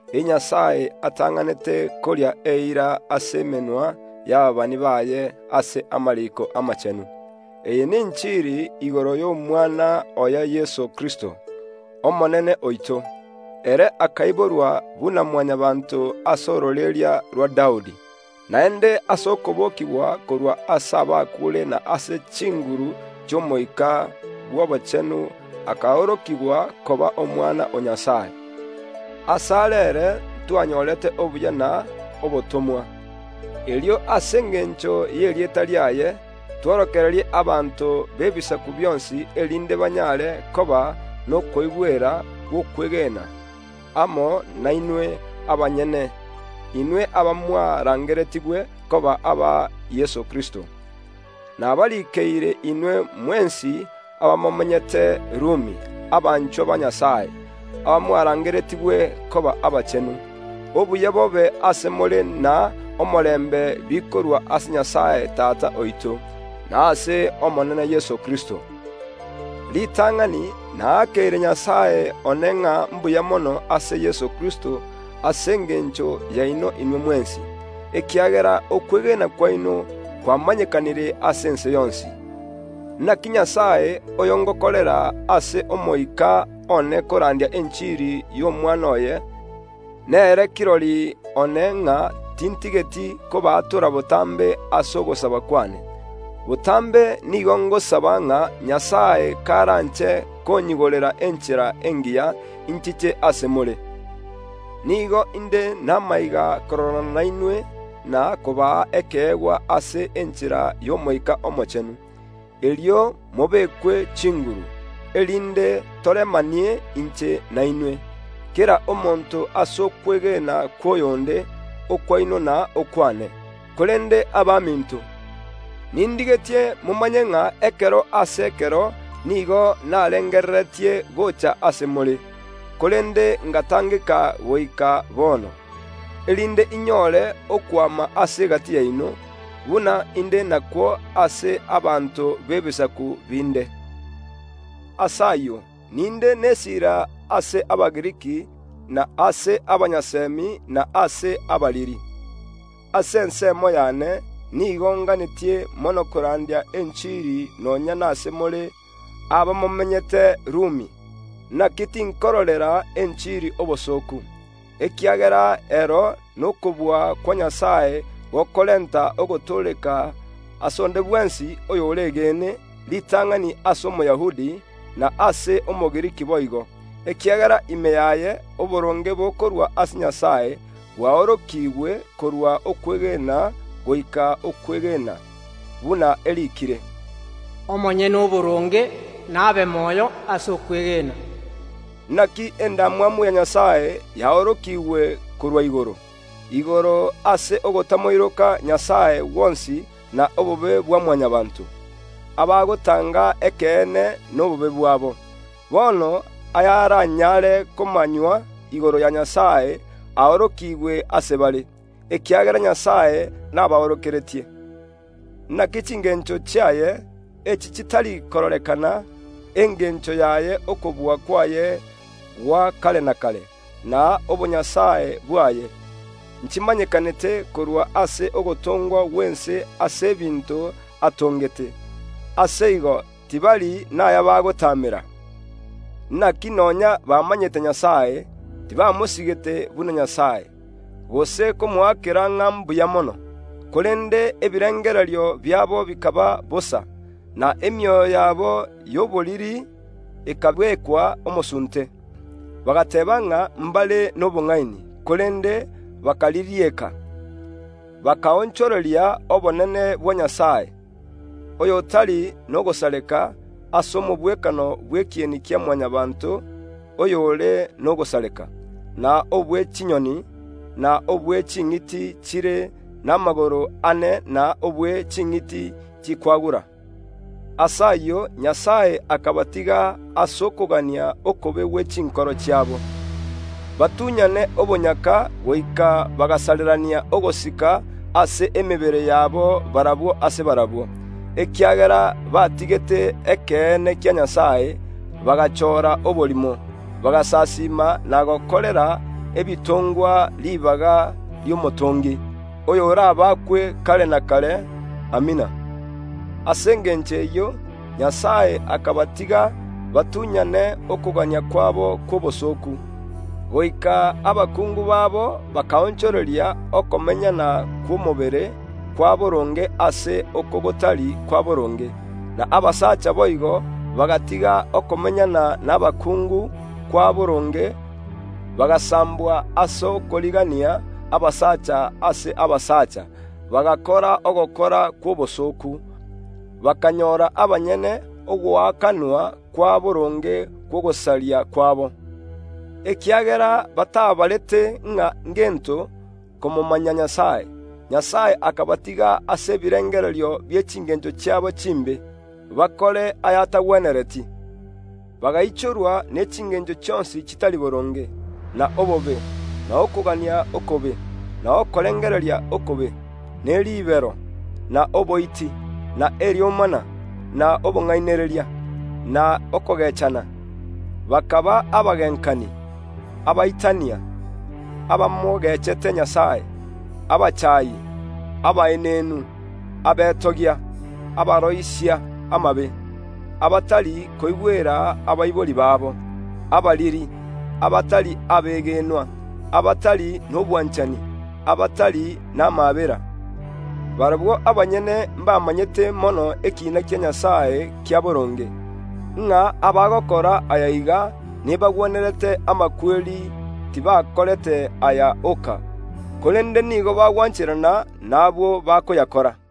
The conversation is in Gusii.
eye Nyasae atang’anete koria eira ase emenwa y’ababani baye ase amariiko amachenu. Eye nenchiri igoro y’Omwana oye Yeso Kristo, Omonene oito. Ere akaiborwa buna Mwanyabaanto ase ororeria rwa Daudi, naende ase okobokigwa korwa ase abakuure na ase chinguru chi’Omoika bw’Obochenu akaorokigwa koba Omwana o Nyasae. Asare ere ntwanyorete obuya na obotomwa, erio ase engencho y’erieta riaye tworokererie abanto b’ebisaku bionsi, erinde banyare koba nokoigwera gw’okwegena amo nainwe abanyene, inwe abamwarangeretigwe koba aba Yeso Kristo. Nabariikeire inwe mwensi abamomenyete Rumi, abanchwa ba Nyasae, abamwarangeretigwe koba abachenu. Obuya bobe ase more na omorembe bikorwa ase Nyasae Tata oito, na ase Omonene Yeso Kristo. Ritang’ani naakeire Nyasae one ng’a mbuya mono ase Yeso Kristo ase engencho yaino inwe mwensi, ekiagera okwegena kwaino kwamanyekanire ase ense yonsi. Inaki Nyasae, oyo ’ngokorera ase omoika one korandia enchiri y’Omwana oye, nere kirori one ng’a tintigeti kobaatora botambe ase ogosaba kwane. Botambe nigo ngosaba ng’a Nyasae karanche konyigorera enchera engiya, inchiche ase more. Nigo inde n’amaiga kororana nainwe na kobaa ekeegwa ase enchera y’Omoika Omochenu, erio mobekwe chinguru, erinde toremanie inche nainwe, kera omonto ase okwegena kw’oyonde, okwaino na okwane. Korende abaminto, nindigetie momanye ng’a ekero ase ekero nigo narengereretie gocha ase more (korende ngatangeka goika bono) erinde inyore okwama ase egati yaino, buna inde nakwo ase abanto b’Ebisaku binde. Ase ayio ninde n’esiira ase Abagiriki na ase abatari Abagiriki, ase abanyasemi na ase abariri. Ase ensemo yane nigo nganetie mono korandia enchiri nonya nase more abamomenyete Rumi. Inaki tinkororera enchiri obosooku, ekiagera ero n’okobua kwa Nyasae gokorenta ogotooreka ase onde bwensi oyo bwegenete, ritang’ani ase Omoyahudi, na ase Omogiriki boigo. Ekiagera ime yaye oboronge bokorwa ase Nyasae bwaorokiigwe korwa okwegena goika okwegena, buna eriikire, “Omonyene oboronge nabe moyo ase okwegena.” Inaki endamwamu ya Nyasae yaorokiigwe korwa igoro, ase ogotamoiroka Nyasae gwonsi na obobe bwa Mwanyabaanto, abagotanga ekeene nobobe bwabo. Bono ayaranyare komanywa igoro ya Nyasae aorokigwe ase bare, ekiagera Nyasae nabaorokeretie. Inaki chingencho chiaye, echi chitari kororekana, engencho yaye okobua kwaye gwa kare na kare, na obonyasae bwaye, nchimanyekanete korwa ase ogotongwa gw’ense ase ebinto atongete. Ase igo tibari naya bagotaamera. Inaki nonya bamanyete Nyasae, tibamosigete buna Nyasae, gose komoakera ng’a mbuya mono; korende ebirengererio biabo bikaba bosa, na emioyo yabo y’oboriri ekabekwa omosunte. Bagateeba ng’a mbare nobong’aini, korende bakaririeka. Bakaonchoreria obonene bwa Nyasae, oyotari n’ogosareka, ase omogwekano bw’ekieni kia Mwanyabaanto oyore nogosareka, na oyobwechinyoni, na bwe ching’iti chire n’amagoro ane, na bwe ching’iti chikwagura. Ase ayio Nyasae akabatiga ase okogania okobe gwe chinkoro chiabo, batunyane obonyaka goika bagasarerania ogosika ase emebere yabo barabwo ase barabwo, ekiagera batigete ekeene kia Nyasae, bagachoora oborimo, bagasasiima na gokorera ebitongwa ribaga ri’Omotongi, oyorabaakwe kare na kare! Amina. Ase engencho eyio Nyasae akabatiga batunyane okogania kwabo kw’obosooku, goika abakungu babo bakaonchoreria okomenyana kw’omobere kwa boronge ase oko gotari kwa boronge. Na abasacha boigo bagatiga okomenyana nabakungu kwa boronge, bagasambwa ase okorigania abasacha ase abasacha, bagakora ogokora kw’obosooku, bakanyora abanyene ogoakanwa kwa boronge kw’ogosaria kwabo. Ekiagera batabarete ng’a ngento komomanya Nyasae, Nyasae akabatiga ase ebirengererio bie chingencho chiabo chimbe, bakore aya’atagwenereti. Bagaichorwa ne chingencho chionsi chitari boronge, na obobe, na okogania okobe, na okorengereria okobe, ne ribero, na oboiti, na eriomana, na obong’ainereria, na okogeechana. Bakaba abagenkani, abaitania, abamogechete Nyasae, abachaayi, abaenenu, abetogia, abaroisia amabe, abatari koigwera abaibori babo, abariri, abatari abegenwa, abatari nobwanchani, abatari n’amaabera. Barabwo abanyene mbamanyete mono ekiina kia Nyasae kia boronge, ng’a abagokora ayaiga nebagwenerete amakweri; tibakorete aya oka, korende nigo bagwancherana nabwo bakoyakora.